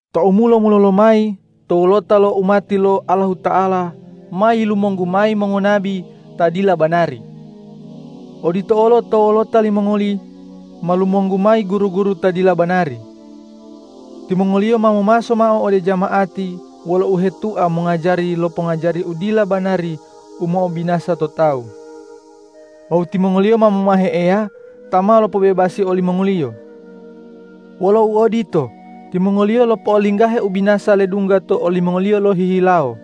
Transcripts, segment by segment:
Tou mulo-mulolo mayi to wolota lo umati lo Allahuta'ala ma yilumonggu mayi mongonabi ta dila banari. Odito olo to wolota limongoli ma lumonggu mayi guru-guru ta dila banari. Timongoliyo ma momaso mao ode jama'ati wolo uhetua mongajari lo pongajari u dila banari u mo'obinasa to tawu. Wawu timongoliyo ma momahe Eya ta ma lopobebasi olimongoliyo. Wolo uodito, timongoliyo lopo'olinggahe ubinasa ledungga to olimongoliyo lohihilawo.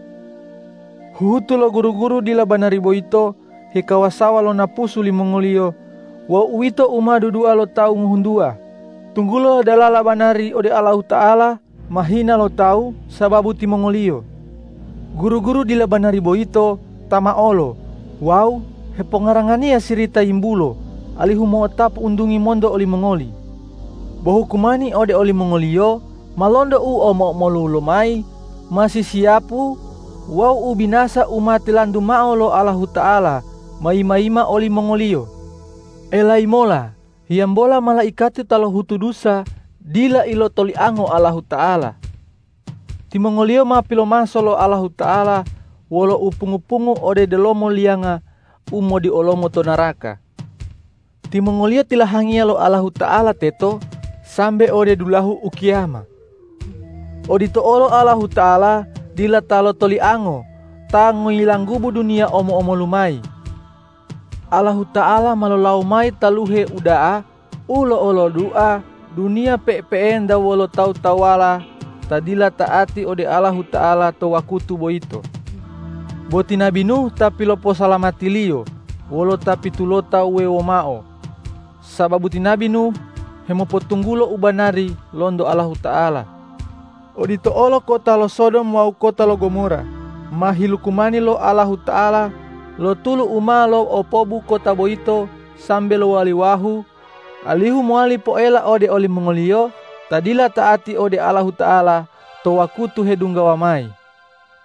Huhutu lo guru-guru dila banari boyito hekawasawa lo napusu limongoliyo wawu uwito u ma dudua lo tawu ngohuntuwa, tunggulo dalala banari ode Allahuta'ala ma hina lo tawu sababu timongoliyo. Guru-guru dila banari boyito tamaolo wawu hepongaranganiya sirita yimbulo, alihu mo'otapu untungi monto olimongoli. Bo hukumani ode olimongoliyo ma lonto u omo-omolu lomayi ma sisiyapu wawu ubinasa u ma tilantu mao lo Allahuta'ala ma yima-yima olimongoliyo. Elayi mola hiyambola malaikati ta lohutu dusa dila ilotoliango Allahuta'ala. Timongoliyo ma pilopomaso mao lo Allahuta'ala wolo upungu-pungu ode delomo liyanga u modiolomo to naraka. Timongoliyo tilahangiya lo Allahuta'ala teto sambe ode dulahu ukiyama. Odito olo Allahuta'ala dila ta lotoliango ta ngoyilanggubu duniya omo-omolu mayi. Allahuta'ala ma lolawo mayi taluhe uda'a u lo'olodua duniya pe'epe'enta wolo tawu-tawuwala ta dila ta'ati ode Allahuta'ala to wakutu boyito. Bo ti nabi Nuh ta piloposalamati-Liyo wolo ta pitulota wuwewo mao, sababu ti nabi Nuh hemopotunggulo u banari lonto Allahuta'ala. Odito olo kota lo Sodom wawu kota lo Gomora ma hilukumani lo Allahuta'ala lo tulu u ma lo'opobu kota boyito sambe lowali wahu, alihu mowali poela ode olimongoliyo ta dila ta'ati ode Allahuta'ala to wakutu hedunggawa mayi.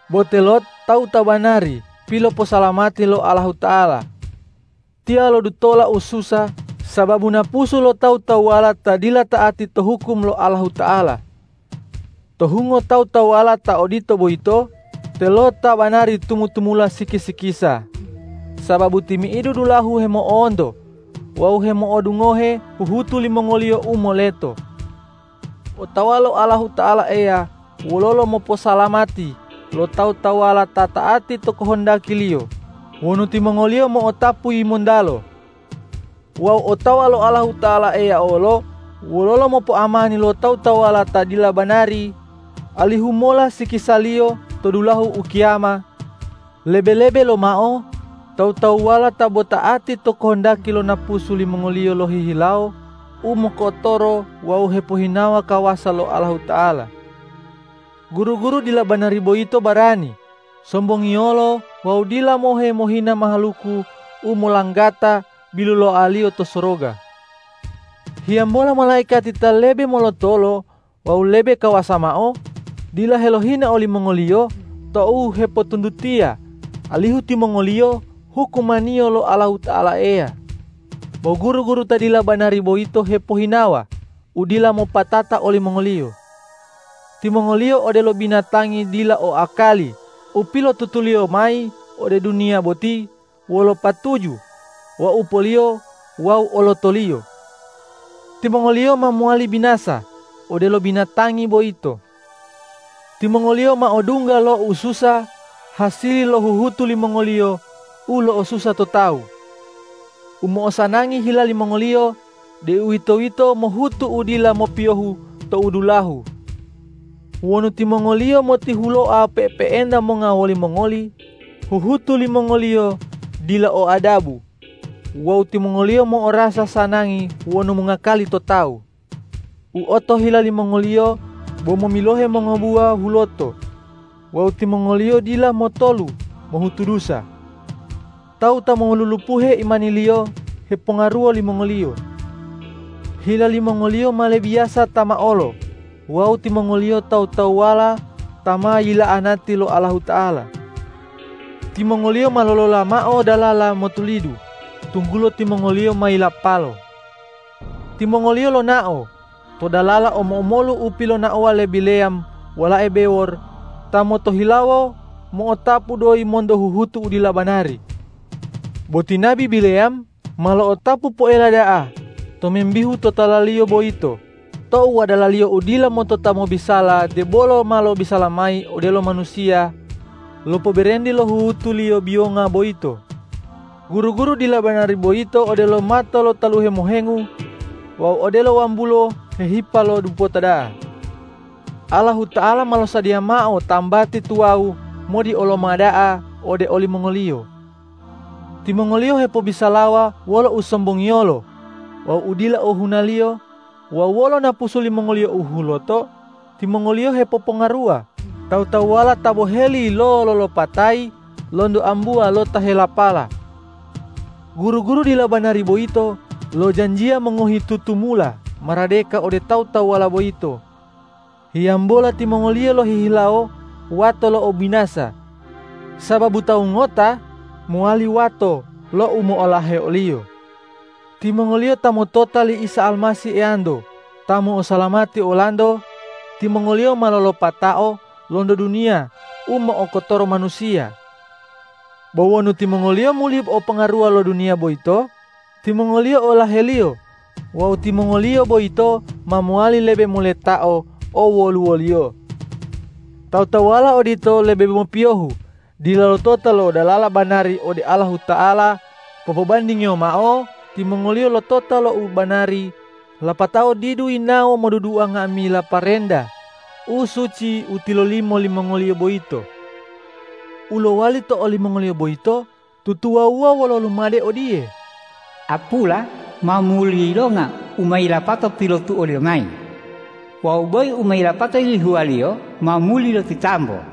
Bo te Lot tawu ta banari piloposalamati lo Allahuta'ala. Tiyo lodutola ususa sababu napusu lo tawu-tawuwala ta dila ta'ati to hukum lo Allahuta'ala. To hungo tawu-tawuwala ta odito boyito te Lot ta banari tumu-tumula siki-sikisa, sababu timi'idu dulahu hemo'onto wawu hemo'odungohe huhutu limongoliyo u moleto. Otawa lo Allahuta'ala Eya wololo moposalamati lo tawu-tawuwala ta ta'ati to kohondaki-Liyo wonu timongoliyo mo'otapu yimontalo. Wawu otawa lo Allahuta'ala Eya olo wololo mopoamani lo tawu-tawuwala ta dila banari, alihu mola sikisaliyo to dulahu ukiyama, lebe-lebe lomao tawu-tawuwala ta bo ta'ati to kohondaki lo napusu limongoliyo lohihilawo u mokotoro wawu hepohinawa kawasa lo Allahuta'ala. Guru-guru dila banari boyito barani, sombongiyolo wawu dila mohe mohina mahaluku u molanggata biluloaliyo to soroga. Hiyambola malaikati ta lebe molotolo wawu lebe kawasa mao, dila helohina olimongoliyo tou hepotuntutiya, alihu timongoliyo hukumaniyo lo Allahuta'ala Eya. Bo guru-guru ta dila banari boyito hepohinawa u dila mopatata olimongoliyo. Timongoliyo odelo binatangi dila o akali u pilotutuliyo mayi ode duniya boti wolo patuju waupoliyo wawu olotoliyo. Timongoliyo ma mowali binasa odelo binatangi boyito. Timongoliyo ma odungga lo ususa hasili lo huhutu limongoliyo u lo'osusa to tawu. U mo'osanangi hila limongoliyo, deuwitoyito mohutu u dila mopiyohu tou dulahu. Wonu timongoliyo motihuloa pe'epe'enta monga wolimongoli, huhutu limongoliyo dila o adabu wawu timongoliyo mo'orasa sanangi wonu mongakali to tawu. U otohila limongoliyo bo momilohe mongobuwa huloto wawu timongoliyo dila motolu mohutu dusa. Tawu ta molulupuhe imaniliyo hepongaruwo limongoliyo. Hila limongoliyo ma lebiyasa tamaolo wawu timongoliyo tawu-tawuwala ta ma yila'anati lo Allahuta'ala. Timongoliyo ma lolola mao dalala motulidu, tunggulo timongoliyo ma yilapalo. Timongoliyo lonao to dalala omo-omolu u pilonaowa le Bileyam walae Bewor, ta motohilawo mo'otapu doyi monto huhutu u dila banari. Bo ti nabi Bileyam ma lo'otapu poela da'a tomimbihu totalaliyo boyito tou wadalaliyo u dila motota mobisala debolo ma lobisala mayi odelo manusiya, lopoberenti lo huhutuliyo biyonga boyito. Guru-guru dila banari boyito odelo mato lo taluhe mohengu wawu odelo wambulo hehipa lo dupota da'a. Allahuta'ala ma losadiya mao tambati tuwawu modioloma da'a ode olimongoliyo. Timongoliyo hepobisalawa wolo usombongiyolo wawu u dila ohunaliyo wawu wolo napusu limongoliyo u huloto timongoliyo hepopongaruwa tawu-tawuwala ta boheli lo lolopatayi lonto ambuwa lo ta helapala. Guru-guru dila banari boyito lojanjiya mongohi tutumula maradeka ode tawu-tawuwala boyito, hiyambola timongoliyo lohihilawo wato lo ubinasa, sababu tawu ngota mowali wato lo u mo'olahe oliyo. Timongoliyo ta motota li Isa Almasih Eyanto ta mo'osalamati olanto, timongoliyo ma lolopatao lonto duniya u mo'okotoro manusiya. Bo wonu timongoliyo muli opongaruwa lo duniya boyito, timongoliyo olaheliyo wawu timongoliyo boyito ma mowali lebe moletao owoluwoliyo. Tawu-tawuwala odito lebe mopiyohu dila lotota lo dalala banari ode Allahuta'ala popobandingiyo mao timongoliyo lotota lo u banari, lapatao didu yinawo modudua nga'amila parenta u suci u tilolimo limongoliyo boyito. U lowali to olimongoliyo boyito tutuwawuwa wolo lumade odiye,”Apula ma muli yilonga u ma yilapato pilotuoliyo mayi” wawu”Boyi u ma yilapato yilihuwaliyo ma muli lotitambo.”